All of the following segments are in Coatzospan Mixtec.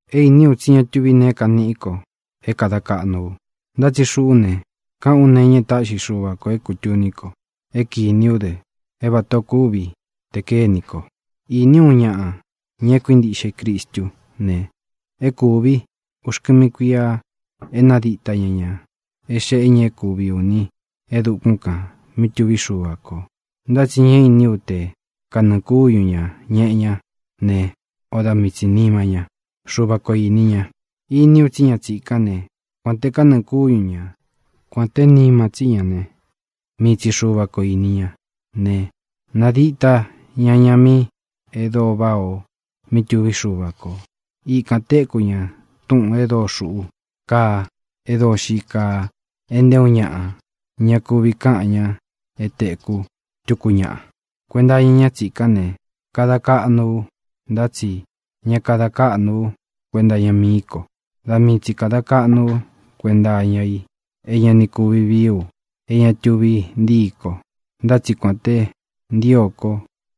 É īní u tsí ña tuví neé kaniꞌí ko é kāda kaꞌnu u, ntá tsi xuꞌú ne, káꞌān ú nee e táꞌxi Xuva kō é kūtuní ko, é kīní u dɨ é vatā ó kuvi te kakénī ko. Iní u uun ñaꞌa, ña e kuíntiꞌxe i Cristú ne, é kūvi uxkɨmi kuíā e nádita ña ñā é xee ña é kuvi ūni é dukún kān mí tuví Xuva kō. Ntá tsi ña iní u te kanɨɨ̄ kúñu ñā ñeꞌe ñá ne, o da mii tsī nima ña. Xuva ko īni ña. Iní u tsí ña tsīkán ne, (kuān te kanɨ́ɨ kúñu ña, kuān té nima tsí ña ne, mii tsi Xuva ko īni ña) ne, nadíta ña ña mí e dóo váꞌā o mí tuví Xuva kō. Ikān téku ña túꞌūn e dóo xūꞌú kaa, e dóo xii kaa, e nté uun ñaꞌa ña kuvi káꞌan ña é tēkú tuku ñaꞌa. Kuenta iña ñá tsīkán ne, kada kaꞌnu ú, ntá tsi ña kada káꞌnu ú kuenta iña mií ko. Da mii tsi kāda kaꞌnu ú kuenta iña i é ña ni kuvi vií u é ña tuvi ntíi ko. Ntá tsi kuān te ntío ko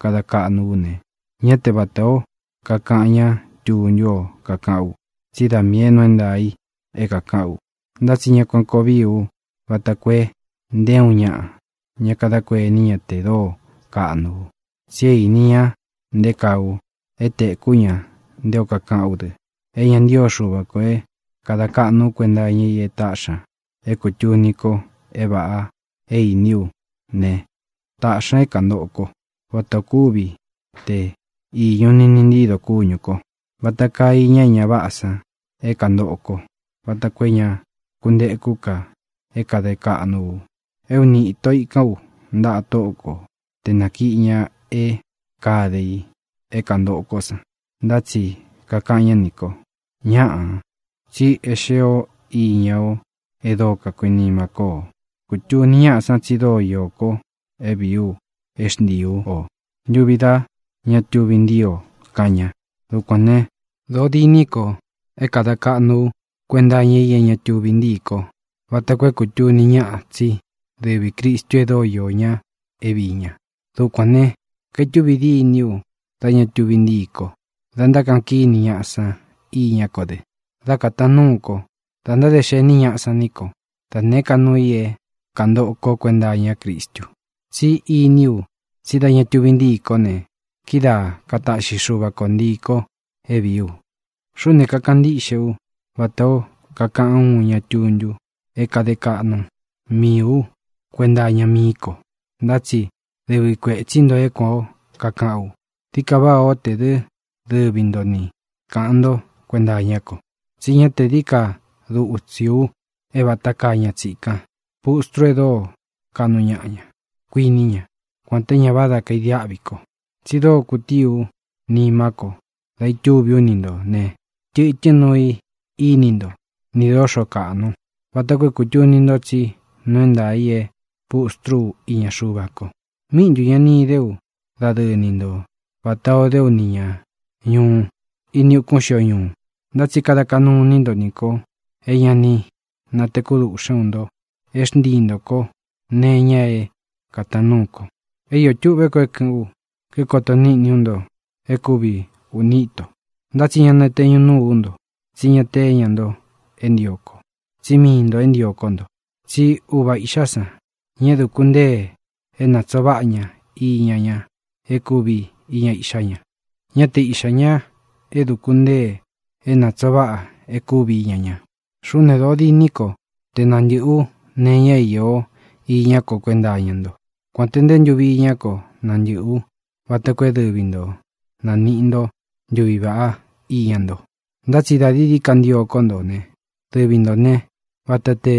kada kaꞌnu ú ne, ñá te vatā ó kakaꞌan ña tuntu ó kakaꞌán u, tsí da miī é nuu é ntaā i é kākaꞌán u. Ntá tsi ña kuān koo vií u vata koo e nté uun ñaꞌa ña kadá kuení ña te dóo kaꞌnu u. Tsi é īni ña nté kaa u é tēkú ña nté o kakaꞌán u dɨ. É ña ntío Xuva kō é kāda kaꞌnu ú kuenta iña i e táꞌxi ña é kūtuní ko é vāꞌa é īní u ne, tāꞌxi ña é kāntoꞌo kó, vatā ó kuvi te īñu niꞌni ntído kúñū ko. Vata kaa iña é ña váꞌā san é kanantōꞌo ko vata koo é ña kuntekú ka é kāde kaꞌnu u. E úni īto ikán u ntaꞌa Tóꞌo ko te nākiꞌi ña é kāde i é kāntoꞌo kó san, ntá tsi kakaꞌan ñá nī ko: “Ñáꞌā, tsi é xéē ó iña o e dóo kakuinimá ko o. Kutuni ñáꞌa tsi dóo īó ko é vīi u é xntiī ú o ntuvi da ña tuvi ntíi o”, kaꞌan ña. Dukuān né, dōo diní ko é kāda kaꞌnu ú kuenta iña i é ña tuvi ntií ko vata koo é kūtuni ñáꞌa tsí dɨvī Cristu e dóo iō ñá é viī ña. Dukuān ne, kaitúvi díni u dá ña tuvi ntíi kó, da ntákaꞌan kíni ñaꞌa san iñá ko dɨ; dá kātaan núu ko, dá ntáde xení ñaꞌa san ní ko, da nēé ka nuu i é kāntoꞌo kó kuenta iñá Cristu. Tsí iní u tsí da ña tuvi ntíi kó ne, kidáa kataꞌxi Xuva ko ntiī ko é vīí u. Xuꞌú ne, kakaꞌan ntíꞌxe ú vatā ó kakaꞌan úun ña tuntu é kade kaꞌnu miī ú kuenta iña mií ko. Ntá tsi dɨvi kuētsí nto é kuān ó kakaꞌán u. Dií ka váꞌa o tē dɨ́ dɨvi nto ni kāꞌan ntó kuenta iñá ko. Tsí ña te dií ka dutsī u é vata kaa ña tsīkán, pustru e dóo kaꞌnu ñaꞌa ña, kuiní ña, kuān té ña váda kaidiáꞌvi ko. Tsi dóo kutíi ú nima ko dá itúvi ú ni ntō ne, tɨtɨ́n nuu i íni nto, nī dóxo kāꞌnu, vata koo é kūtuni nto tsí nuu é ntaā i é pustrú u iña Xuva ko. ¿Míꞌi ntū ña ni idé u dadɨɨ ni nto vatā ó de ú nī ña ñuꞌu ini ukún xio ñuu? Ntá tsi kada kaꞌnu iní nto nī ko é ña ni natēkú duꞌxén u nto é xntii ntō kó nee iña é kātaan núu ko. É iō tuꞌvé ko é kɨ̄ꞌɨ́n u, kíkoto níꞌni ú nto é kūvi uni íto. Ntá tsi ñá nateñu nūu ú nto, tsí ña te íña nto e ntío ko, tsí miī nto é ntio kó nto. Tsí uva iꞌxá san, ña é dūku ntée é nātsoo váꞌa ña iña ña é kūvi iña iꞌxá ña, ñá te iꞌxā ña é dūku ntée é nātsoo váꞌa é kūvi iña ña. Xuꞌú ne, dōo diní ko te nantɨ̄ꞌɨ ú nee iña é īó iñá ko kuenta iña ntó, kuān té nte ntuvi iñá ko nantɨꞌɨ̄ ú vata koo é dɨvi nto nāniꞌi nto ntuví vaꞌá iña nto. Ntá tsi dā dií dií ka ntio kó nto ne, dɨvi ntō né, vata te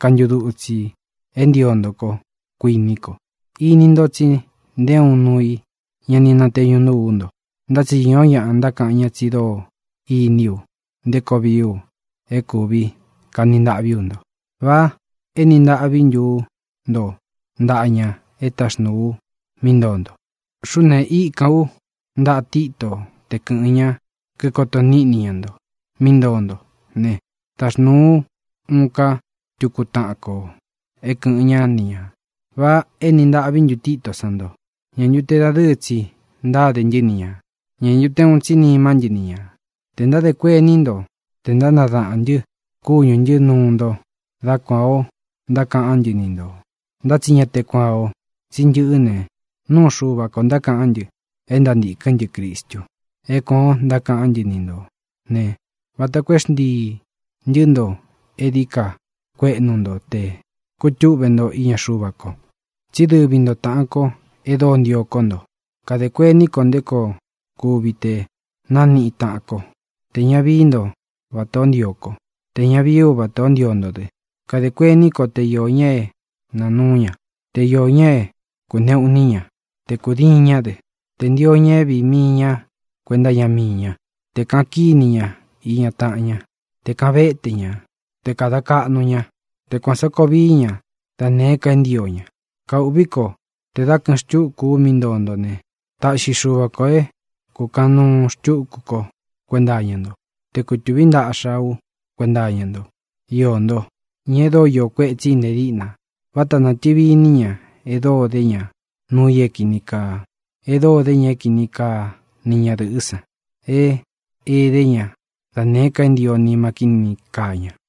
kantudutsī é ntio nto kó, kuiní ko. Ini nto tsi nté uun nuu i ña ni nateñu núu ú nto. Ntá tsi īó ñaꞌa ntákaꞌan ña tsi dóo iní u nté koo vií u é kūvi kani ntaꞌví u nto. ¿Vá eni ntāꞌví ntu ú nto ntaꞌa ña e táxnūu u mí ntoo nto? Xuꞌú ne, íkān ú ntaꞌa Títo te kɨ̄ꞌɨn ña, kíkoto níꞌni ña nto mí ntoo nto ne, taxnūu ú uun ká tuku taꞌan ko é kɨ̄ꞌɨn ñá ni ñā. ¿Vá eni ntaꞌví ntu Titó san nto? ¿Ñā ntu te dadɨɨ́ tsi ntáde ntɨ́ ni ñā? ¿Ñā ntu te uun tsi nimá ntɨ ni ñā? Tē ntádē kuení nto tē ntánadaꞌān ntɨ́ kúñū ntɨ́ nuu nto, dá kuān ó ntákaꞌán ntɨ ni ntō. Ntá tsi ña te kuan ō. Tsí ntɨꞌɨ́ ne, nuu Xúva ko ntákaꞌán ntɨ e ntántīkɨ́n ntɨ Cristu. É kuān o ntákaꞌán ntɨ ni ntō ne, vata koo é xntiī ntɨ́ nto e dií ka kueꞌnu nto te kutúꞌve nto iña Xuva ko. Tsí dɨvi ntō táꞌān ko e dóo ntio kó nto. Kadē kuení ko nté koo kuvi te nániꞌi taꞌan ko: tē ña vií nto vatā ó ntio kó, tē ña vií u vatā ó ntio nto dɨ. Kadē kuení ko te iō ña é nāa núu ña, te iō ña é kūneꞌu iní ña, te kūdiin ñá dɨ, tē ntio ña é vīi mii ñá kuenta iña mii ñá, te kāꞌan kíni ña iña taꞌan ñá, te kāꞌan véte ña, te kāda kaꞌnu ña, te kuān sá koo vii ña da nēé ka é ntio ña. Kaūꞌví ko tē dá kɨ̄ꞌɨn xtúku ú mí ntoo nto ne, taꞌxi Xuva kō é kūkaꞌan nuu xtukú ko kuénta iña ntó, te kutūví ntaꞌxa ú kuenta iña ntó, iō ntó, ña e dóo iō kuetsí i nte díꞌna. Váta nātɨvi iní ña e dóo dé ña nuu i é kīni kaa, e dóo dé ña é kini kaa ni ñadɨ̄ꞌɨ́ san, é edé ña da nēé ka é ntio nima kíni kaa ña.